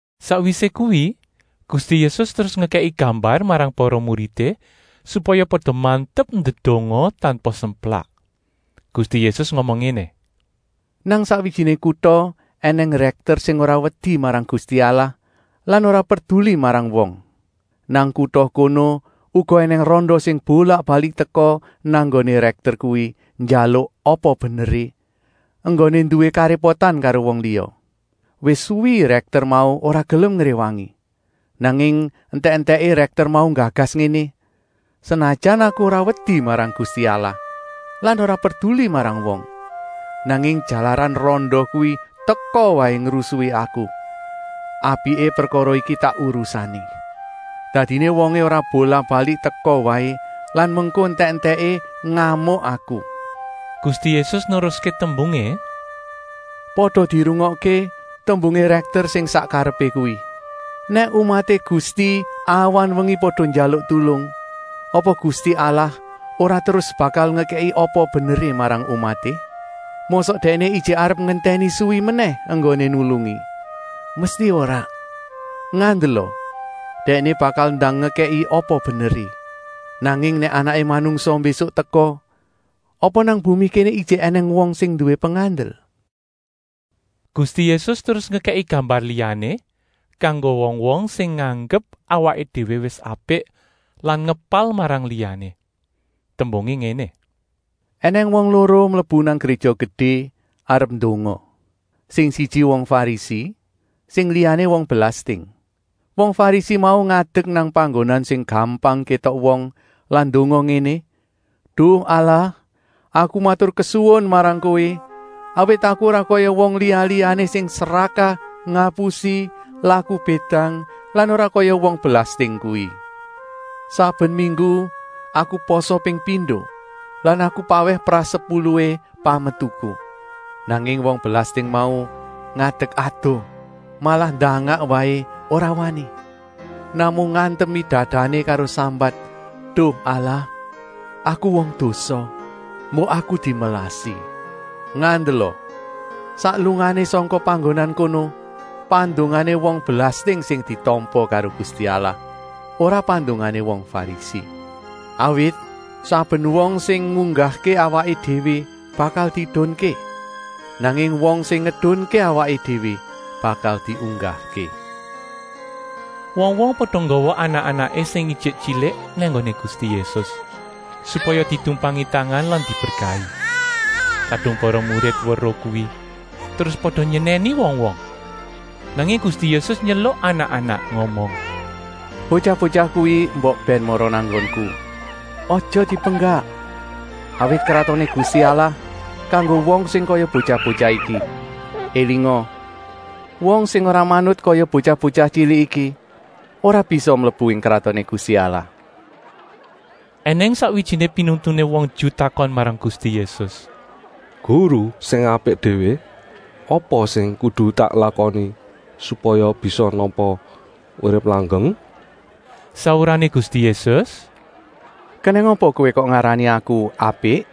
Sakwisé kuwi Gusti Yésus terus ngekèki gambar marang para muridé, supaya pada mantep ndedonga tanpa semplak. Gusti Yésus ngomong ngéné: “Nang sakwijiné kuta ènèng rèkter sing ora wedi marang Gusti Allah lan ora perduli marang wong. Nang kuta kono uga ènèng randa sing bolak-balik teka nang nggoné rèkter kuwi njaluk apa beneré, enggoné nduwé karépotan karo wong liya. Wis suwi rèkter mau ora gelem ngréwangi. Nanging entèk-entèké rèkter mau nggagas ngéné: ‘Senajan aku ora wedi marang Gusti Allah lan ora perduli marang wong, nanging jalaran randa kuwi teka waé ngrusui aku, apiké prekara iki tak urusané. Dadiné wongé ora bolak-balik teka waé lan mengko entèk-entèké ngamuk aku!’” Gusti Yésus neruské tembungé: “Pada dirungokké tembungé rèkter sing sak karepé kuwi. Nèk umaté Gusti awan-wengi pada njaluk tulung, apa Gusti Allah ora terus bakal ngekèki apa beneré marang umaté? Mosok Dèkné ijik arep ngentèni suwi menèh enggoné nulungi? Mesti ora! Ngandela, Dèkné bakal ndang ngekèki apa beneré. Nanging nèk Anaké Manungsa mbésuk teka, apa nang bumi kéné ijik ènèng wong sing nduwé pengandel?” Gusti Yésus terus ngekèki gambar liyané kanggo wong-wong sing nganggep awaké déwé wis apik lan ngepal marang liyané. Tembungé ngéné: “Enèng wong loro mlebu nang Gréja Gedé arep ndonga. Sing siji wong Farisi, sing liyané wong belasting. “Wong Farisi mau ngadek nang panggonan sing gampang kétok wong lan ndonga ngéné: ‘Duh Allah, aku maturkesuwun marang Kowé, awit aku ora kaya wong liya-liyané sing srakah, ngapusi, laku bédang lan ora kaya wong belasting kuwi. Saben minggu aku pasa ping pindo lan aku pawèh prasepuluhé pametuku.’ “Nanging wong belasting mau ngadek adoh, malah ndangak waé ora wani, namung ngantemi dadané karo sambat: ‘Duh Allah, aku wong dosa, mbok aku dimelasi!’ Ngandela, sak lungané sangka panggonan kono, pandongané wong belasting sing ditampa karo Gusti Allah, ora pandongané wong Farisi. Awit saben wong sing ngunggahké awaké déwé bakal diedunké, nanging wong sing ngedunké awaké déwé bakal diunggahké.” Wong-wong pada nggawa anak-anaké sing ijik tyilik nang nggoné Gusti Yésus, supaya ditumpangi tangan lan diberkahi. Kadung para murid weruh kuwi terus pada nyenèni wong-wong. Nanging Gusti Yésus nyeluk anak-anak ngomong: “Botyah-botyah kuwi mbok bèn mara nang nggonku. Aja dipenggak, awit Kratoné Gusti Allah kanggo wong sing kaya botyah-botyah iki. Elinga, wong sing ora manut kaya botyah-botyah tyilik iki ora bisa mlebu ing Kratoné Gusti Allah.” Enèng sakwijiné pinuntuné wong Ju takon marang Gusti Yésus: “Guru sing apik déwé, apa sing kudu tak lakoni supaya bisa nampa urip langgeng?” Saurané Gusti Yésus: “Kenèng apa kowé kok ngarani Aku apik?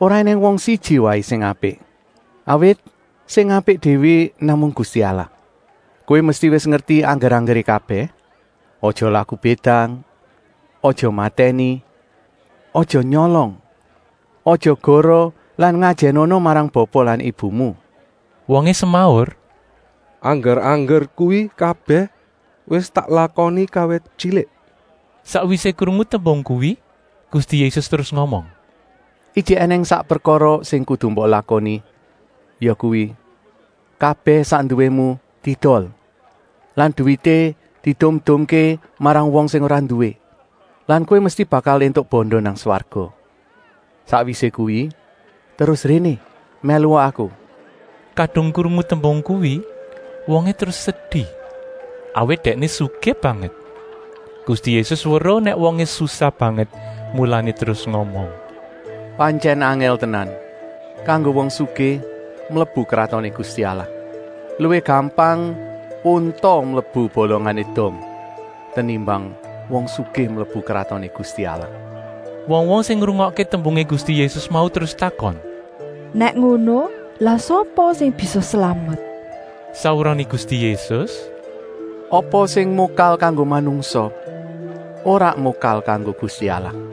Ora ènèng wong siji waé sing apik, awit sing apik déwé namung Gusti Allah. Kowé mesti wis ngerti angger-anggeré kabèh: aja laku bédang, aja matèni, aja nyolong, aja goroh lan ngajènana marang bapa lan ibumu!” Wongé semaur: “Angger-angger kuwi kabèh wis tak lakoni kawit tyilik.” Sakwisé krungu tembung kuwi Gusti Yésus terus ngomong: “Ijik ènèng sak prekara sing kudu mbok lakoni, yakuwi, kabèh sak nduwému diedol lan duwité diedum-edumké marang wong sing ora nduwé lan kowé mesti bakal éntuk banda nang swarga. Sakwisé kuwi terus réné mèlua Aku.” Kadung krungu tembung kuwi wongé terus sedi, awit dèkné sugih banget. Gusti Yésus weruh nèk wongé susah banget, mulané terus ngomong: “Pantyèn angèl tenan kanggo wong sugih mlebu Kratoné Gusti Allah! Luwih gampang unta mlebu bolongané dom tenimbang wong sugih mlebu Kratoné Gusti Allah.” Wong-wong sing ngrungokké tembungé Gusti Yésus mau terus takon: “Nèk ngono, lah sapa sing bisa slamet?” Saurané Gusti Yésus: “Apa sing mokal kanggo manungsa ora mokal kanggo Gusti Allah.”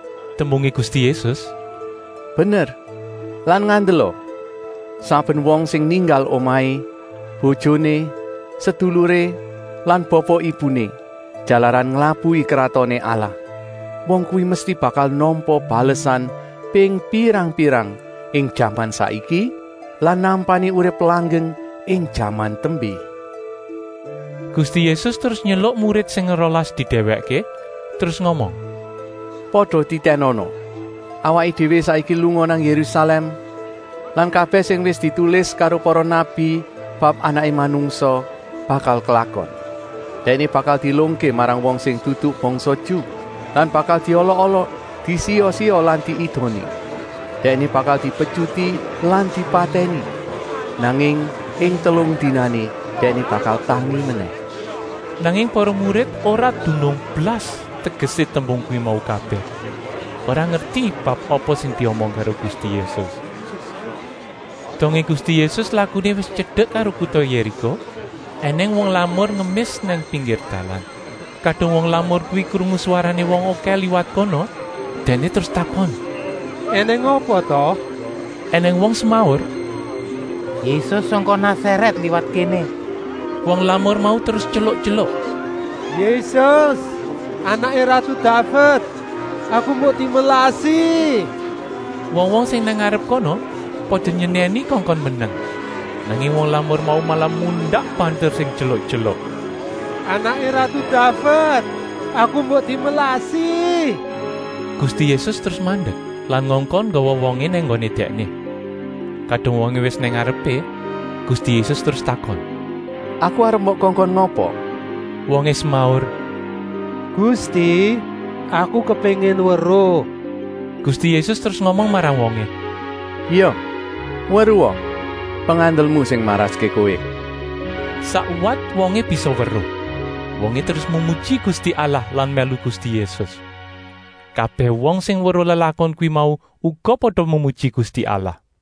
Tembungé Gusti Yésus: “Bener! Lan ngandela, saben wong sing ninggal omahé, bojoné, seduluré lan bapa-ibuné, jalaran nglabuhi kratoné Allah, wong kuwi mesti bakal nampa balesan ping pirang-pirang ing jaman saiki lan nampani urip langgeng ing jaman tembé.” Gusti Yésus terus nyeluk murid sing rolas didèwèkké terus ngomong: “Pada titènana! Awaké déwé saiki lunga nang Yérusalèm lan kabèh sing wis ditulis karo para nabi bab Anaké Manungsa bakal klakon. Dèkné bakal dielungké marang wong sing dudu bangsa Ju lan bakal diolok-olok, disiya-siya lan diidoni. Dèkné bakal dipetyuti lan dipatèni, nanging ing telung dinané dèkné bakal tangi menèh.” Nanging para murid ora dunung blas tegesé tembung kuwi mau kabèh, ora ngerti bab apa sing diomong karo Gusti Yésus. Dongé Gusti Yésus lakuné wis tyedek karo kuta Yériko ènèng wong lamur ngemis nang pinggir dalan. Kadung wong lamur kuwi krungu swarané wong okèh liwat kono, dèkné terus takon: “Enèng apa ta?” Enèng wong semaur: “Yésus sangka Nasarèt liwat kéné!” Wong lamur mau terus tyeluk-tyeluk: “Yésus, Anaké ratu Daved, aku mbok dimelasi!” Wong-wong sing nang ngarep kono pada nyenèni kongkon meneng, nanging wong lamur mau malah mundak banter sing tyeluk-tyeluk: “Anaké ratu Daved, aku mbok dimelasi!” Gusti Yésus terus mandek lan ngongkon nggawa wongé nang nggoné Dèkné. Kadung wongé wis nang ngarepé, Gusti Yésus terus takon: “Aku arep mbok kongkon ngapa?” Wongé semaur: “Gusti, aku kepéngin weruh!” Gusti Yésus terus ngomong marang wongé: “Ya, weruha! Pengandelmu sing maraské kowé.” Sakwat wongé bisa weruh. Wongé terus memuji Gusti Allah lan mèlu Gusti Yésus. Kabèh wong sing weruh lelakon kuwi mau uga pada memuji Gusti Allah.